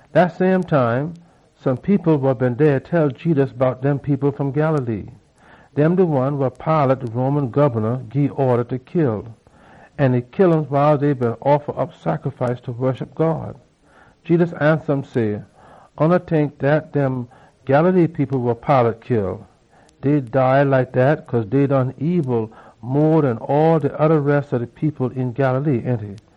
Dat same time, some people wa been dey tell Jedus bout dem people fom Galilee wa Pilate, de Roman gobna, gii orda fa kill wiles dey beena offa op sacrifice fa woshup God. Jedus ansa um say, “Oona tink dat dem Galilee people wa Pilate kill, dey dead like dat cause dey done ebil mo den all de oda res ob de people een Galilee, ainty?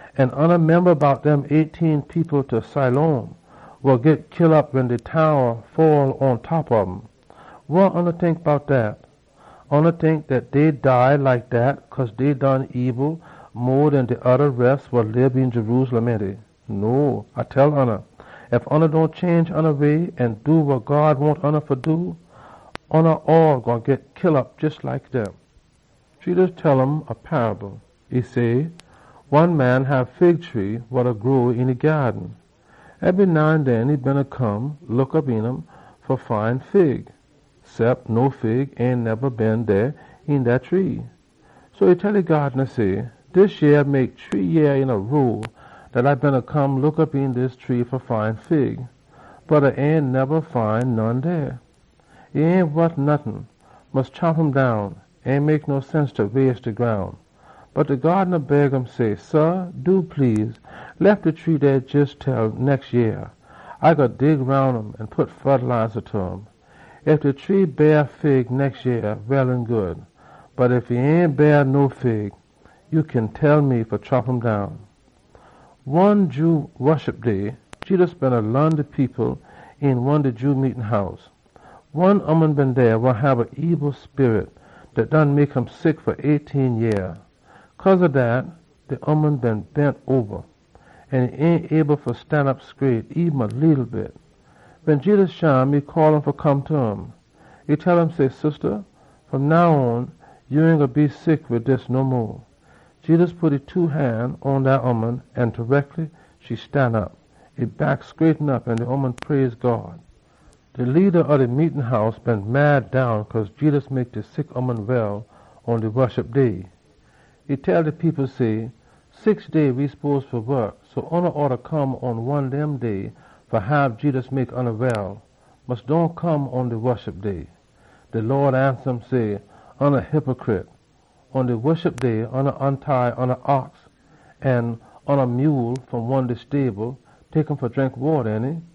An oona memba bout dem eighteen people ta Siloam, wa git kill op wen de towa fall pontop um? Wa oona tink bout dat? Oona tink dat dey dead like dat cause dey done ebil mo den de oda res wa lib een Jerusalem, ainty? No, A da tell oona, ef oona dohn change oona sinful way, oona gwine git kill op jes like dem.” Jedus tell um a paable. E say, “One man hab fig tree wa beena grow een e gyaaden. Ebry now an den e beena come look op een um fa find fig, cep no fig ain neba been dey een dat tree. So e tell e wokman say, ‘Dis yeah mek shree yeah dat A beena come look op een dis tree fa find fig, bot A ain neba find none dey. E ain wot nottin. Mus chop um down! Ain mek no sense fa waste de groun.’ Bot de wokman beg um say, ‘Sah, do please, lef de tree dey jes til nex yeah. A gwine dig roun um an pit fertiliza ta um. Ef de tree beah fig nex yeah, well an good. Bot ef e ain beah no fig, ya kin tell me fa chop um down.’” One Jew Woshup Day, Jedus beena laan de people een one Jew meetin house. One ooman been dey wa hab a ebil sperit dat done mek um sick fa eighteen yeah. Cause ob dat, de ooman been bend oba an e ain able fa stanop scraight. Wen Jedus shim, e call um fa come ta um. E tell um say, “Sista, fom now on, ya ain gwine be sick wid dis no mo!” Jedus pit e two han pon dat ooman, an tareckly e stanop. E back scraighten op, an de ooman praise God. De leada ob de meetin house been mad down cause Jedus mek de sick ooman well pon de Woshup Day. E tell de people say, “Six day we spose fa wok, so oona oughta come pon one dem day fa hab Jedus heal oona. Mus dohn come pon de Woshup Day!” De Lawd ansa um say, “Oona hypicrit! Pon da Woshup Day oona ontie oona ox or mule fom de stable, tek um fa drink wata, ainty?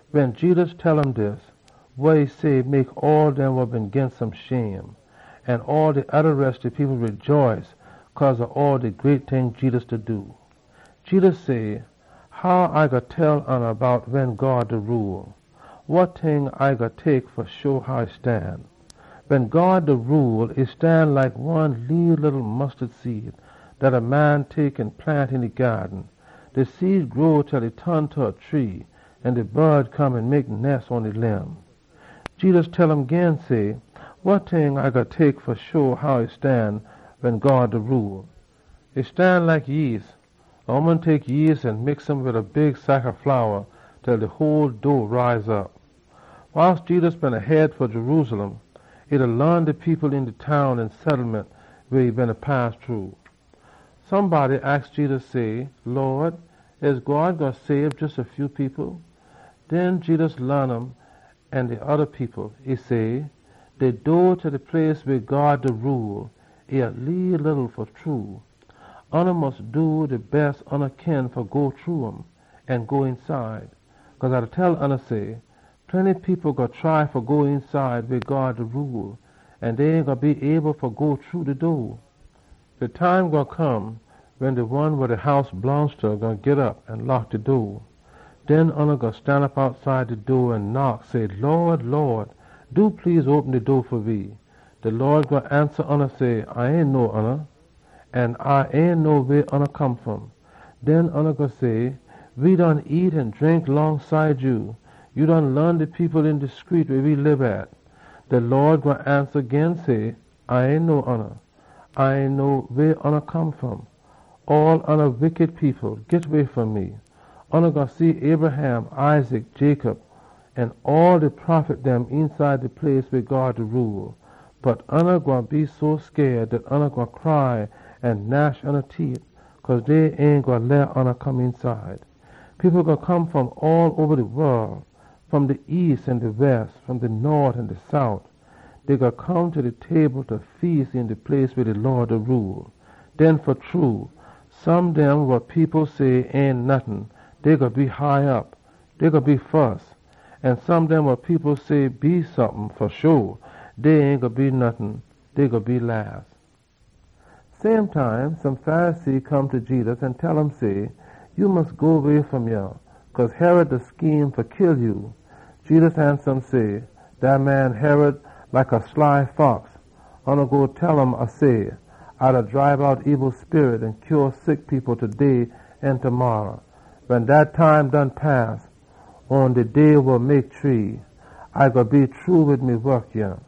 Wen Jedus tell um dis, wa e say mek all dem wa been ginst um shame. An all de oda res de people rejaice cause ob all de great ting dem Jedus beena do. Jedus say, “Wa e like wen God da rule? Wa ting A gwine tek fa sho how e stan? Wen God da rule, e stan like one leeleetle mustard seed dat a man tek an plant een e gyaaden. De seed grow til e ton ta a tree, an de bod dem come an mek nes pon e limb.” Jedus tell um gin say, “Wa ting A gwine tek fa sho how e stan wen God da rule? E stan like yeast wa a ooman tek an mix um wid a big sack ob flour til de whole dough rise op.” Wiles Jedus beena head fa Jerusalem, e beena laan de people een dem town an settlement weh e pass shru. Somebody aks Jedus say, “Lawd, e jes a few people wa God gwine sabe?” Den Jedus laan um an de oda people. E say, “De door ta de place weh God da rule, e leeleetle fa true. Oona mus do de bes ya kin fa go shru um an go eenside. Cause A da tell oona say, plenty people gwine try fa go eenside weh God da rule an dey ain gwine be able fa go shru de door. De time gwine come wen de one wa de house blongst ta gwine git op an lock de door. Den oona gwine stanop outside de door an knock, say, ‘Lawd, Lawd, do please, open de door fa we!’ De Lawd gwine ansa say, ‘A ain know oona. An A ain know weh oona come fom!’ Den oona gwine say, ‘We done nyam an drink longside ya. Ya done laan de people een de screet weh we lib at!’ De Lawd gwine ansa gin say, ‘A ain know oona. A ain know weh oona come fom. All oona wickity people, git way fom me!’ Oona gwine see Abraham, Isaac, Jacob an all de prophet dem eenside de place weh God da rule. Bot oona gwine cry an gnash ya teet, cause dey gwine chunk oona out. People gwine come fom all oba de wol, fom de east an de west, fom de nort an de sout. Dey gwine come ta de table fa feas een de place weh God da rule. Den fa true some dem wa las now, dey gwine be fus, an some dem wa fus now, dey gwine be las.” Same time, some Pharisee come ta Jedus an tell um say, “Ya mus go way fom yah, cause Herod da scheme fa kill ya.” Jedus ansa um say, “Dat man Herod like a fox. Oona go tell um A say, ‘A da dribe out ebil sperit an heal sick people taday an demarra. Wen dat time done pass, atta shree day, A gwine be shru wid me wok yah.’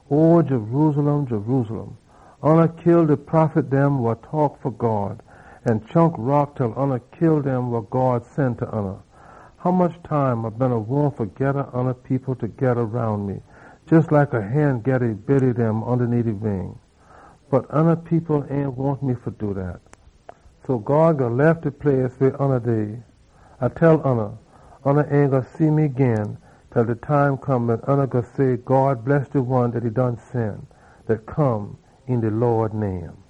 “O Jerusalem, Jerusalem! Oona kill de prophet dem an chunk rock til oona kill dem wa God sen ta oona! Hommuch time A been wahn fa geda oona people togeda roun me, jes like a hen geda e biddy dem ondaneet e wing! Bot oona people ain wahn me fa do dat! So God gwine lef de place weh oona dey. A da tell oona, oona ain gwine see me gin til de time come wen oona gwine say, ‘God bless de one dat e done sen, dat come een de Lawd name.’”